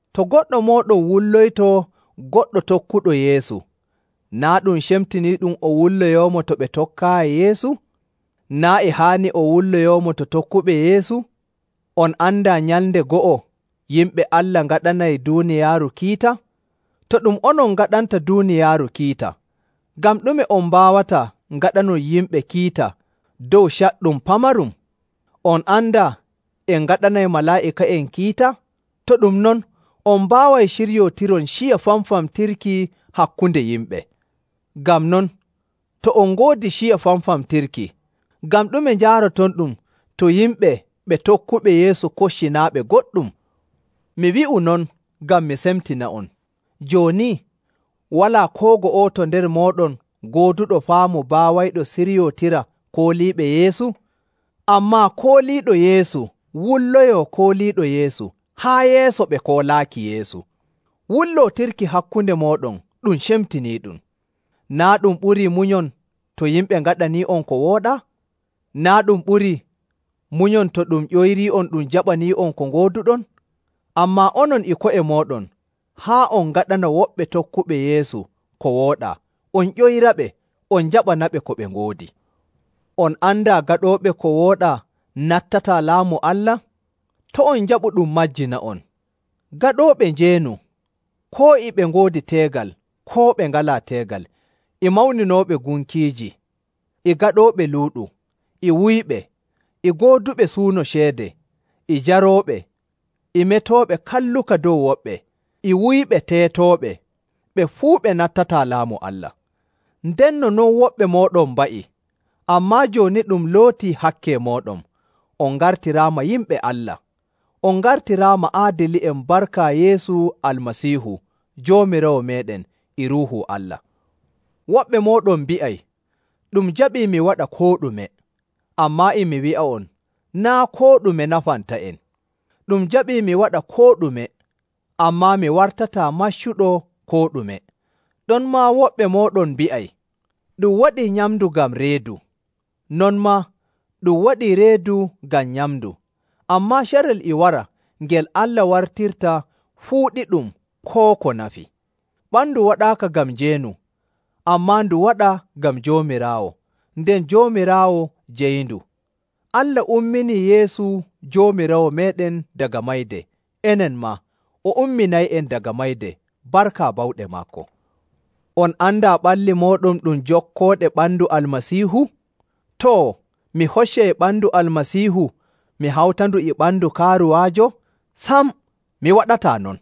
To goɗɗo mooɗon wulloyto goɗɗo tokkuɗo Yeesu, naa' ɗum cemtiniiɗum o wulloyoomo to ɓe tokkaayi Yeesu? Naa' e haani o wulloyoomo to tokkuɓe Yeesu? On andaa nyalnde go'o yimɓe Allah ngaɗanay duuniyaaru kiita? To ɗum onon ngaɗanta duuniyaaru kiita, ngam ɗume on mbaawataa ngaɗanon yimɓe kiita dow caɗɗum pamarum? On andaa en ngaɗanay malaa'ika'en kiita? To ɗum non, on mbaaway ciryootiron ciya famfamtirki hakkunde yimɓe! Ngam non, to on ngoodi ciya famfamtirki, ngam ɗume njaarotonɗum to yimɓe ɓe tokkuɓe Yeesu kocci naa' ɓe goɗɗum? Mi wi'u non ngam mi semtina'on. Jooni, walaa koo go'oto nder mooɗon gooduɗo faamu baawayɗo siryootira kooliiɓe Yeesu? Ammaa kooliiɗo Yeesu wulloyoo kooliiɗo Yeesu, haa yeeso ɓe koolaaki Yeesu! Wullootirki hakkunde mooɗon ɗum cemtiniiɗum. Naa' ɗum ɓurii munyon to yimɓe ngaɗanii'on ko wooɗaa? Naa' ɗum ɓurii munyon to ɗum ƴoyrii'on ɗum jaɓanii'on ko ngooduɗon? Ammaa onon e ko'e mooɗon haa on ngaɗana woɓɓe tokkuɓe Yeesu ko wooɗaa on ƴoyraɓe on njaɓanaɓe ko ɓe ngoodi! On andaa gaɗooɓe ko wooɗaa nattataa Laamu Allah? To' on njaɓu ɗum majjina'on. Gaɗooɓe njeenu, koo e ɓe ngoodi teegal koo ɓe ngalaa teegal, e mawninooɓe gunkiiji, e gaɗooɓe luuɗu, e wuyɓe, e gooduɓe suuno ceede, e jarooɓe, e metooɓe kalluka dow woɓɓe, e wuyɓe teetooɓe, ɓe fuu ɓe nattataa Laamu Allah. Ndenno non woɓɓe mooɗon mba'i. Ammaa jooni ɗum lootii hakke mooɗon, on ngartiraama yimɓe Allah, on ngartiraama aadili'en barka Yeesu Almasiihu Joomiraawo meeɗen e Ruuhu Allah. Woɓɓe mooɗon mbi'ay, “Ɗum jaɓii mi waɗa koo ɗume,” ammaa e mi wi'a'on naa' koo ɗume nafanta'en. Ɗum jaɓii mi waɗa koo ɗume, ammaa mi wartataa maccuɗo koo ɗume. Ɗonmaa woɓɓe mooɗon mbi'ay, “Ɗum waɗii nyamndu ngam reedu, non maa ɗum waɗii reedu ngam nyamndu,” ammaa carel e wara ngel Allah wartirta fuu ɗiɗum koo ko nafi. Ɓandu waɗaaka ngam njeenu, ammaa ndu waɗaa ngam Joomiraawo, nden Joomiraawo jeyindu. Allah umminii Yeesu Joomiraawo meeɗen daga mayde, enen maa o umminay'en daga mayde barka bawɗe maako. On andaa ɓalli mooɗon ɗum jokkooɗe ɓandu Almasiihu? Too, mi hoccay ɓandu Almasiihu mi hawtandu e ɓandu kaaruwaajo? Sam, mi waɗataa non!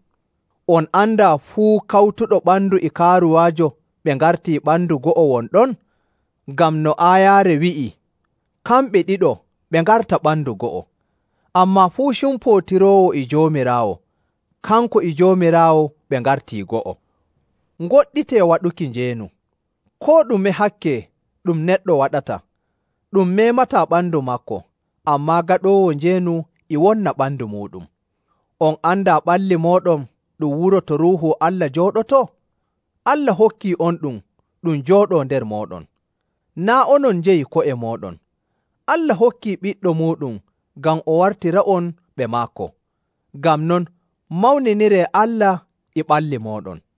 On andaa fuu kawtuɗo ɓandu e kaaruwaajo ɓe ngartii ɓandu go'o won ɗon? Ngam no aayaare wi'i, “Kamɓe ɗiɗo ɓe ngarta ɓandu go'o.” Ammaa fuu cumpootiroowo e Joomiraawo, kanko e Joomiraawo ɓe ngartii go'o. Ngoɗɗitee waɗuki njeenu! Koo ɗume hakke ɗum neɗɗo waɗata, ɗum meemataa ɓandu maako, ammaa gaɗoowo njeenu e wonna ɓandu muuɗum. On andaa ɓalli mooɗon ɗum wuro to Ruuhu Allah jooɗotoo? Allah hokkii'onɗum ɗum jooɗoo nder mooɗon. Naa' onon njeyi ko'e mooɗon. Allah hokkii Ɓiɗɗo muuɗum ngam o wartira'on ɓe maako. Ngam non, mawniniree Allah e ɓalli mooɗon.